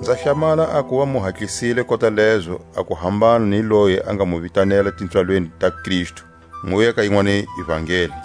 Nza hlamala a kuva mu hatlisile kota lezo a ku hambana ni loyi a nga mu vitanela tipswalweni ta Kristu, muya ka yinwani ivangeli.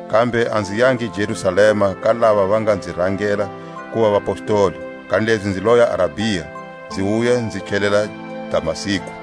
kambe a nzi yangi Jerusalema ka lava va nga nzi rangela kuva vapostoli; kanilezi nzi loya Arabia, nzi wuya nzi tlhelela Damasku.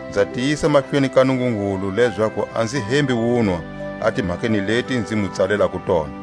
Nza tiyisa mahlweni ka Nungungulu lezaku a nzi hembi wunwa a timhakeni leti nzi mu tsalelako tona.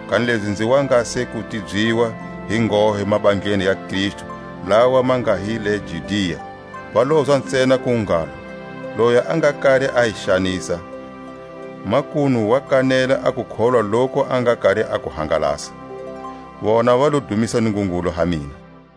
Kanilezi nzi wa nga se ku tibyiwa hi nghohe mabandleni ya Kristu lawa ma nga hi le Judia. Va lozwa ntsena ku ngalo: Loyi a nga kari a hi xanisa, makunu wa kanela a kukholwa loku a nga kari a ku hangalasa. Vona va lo dumisa Nungungulu ha mina.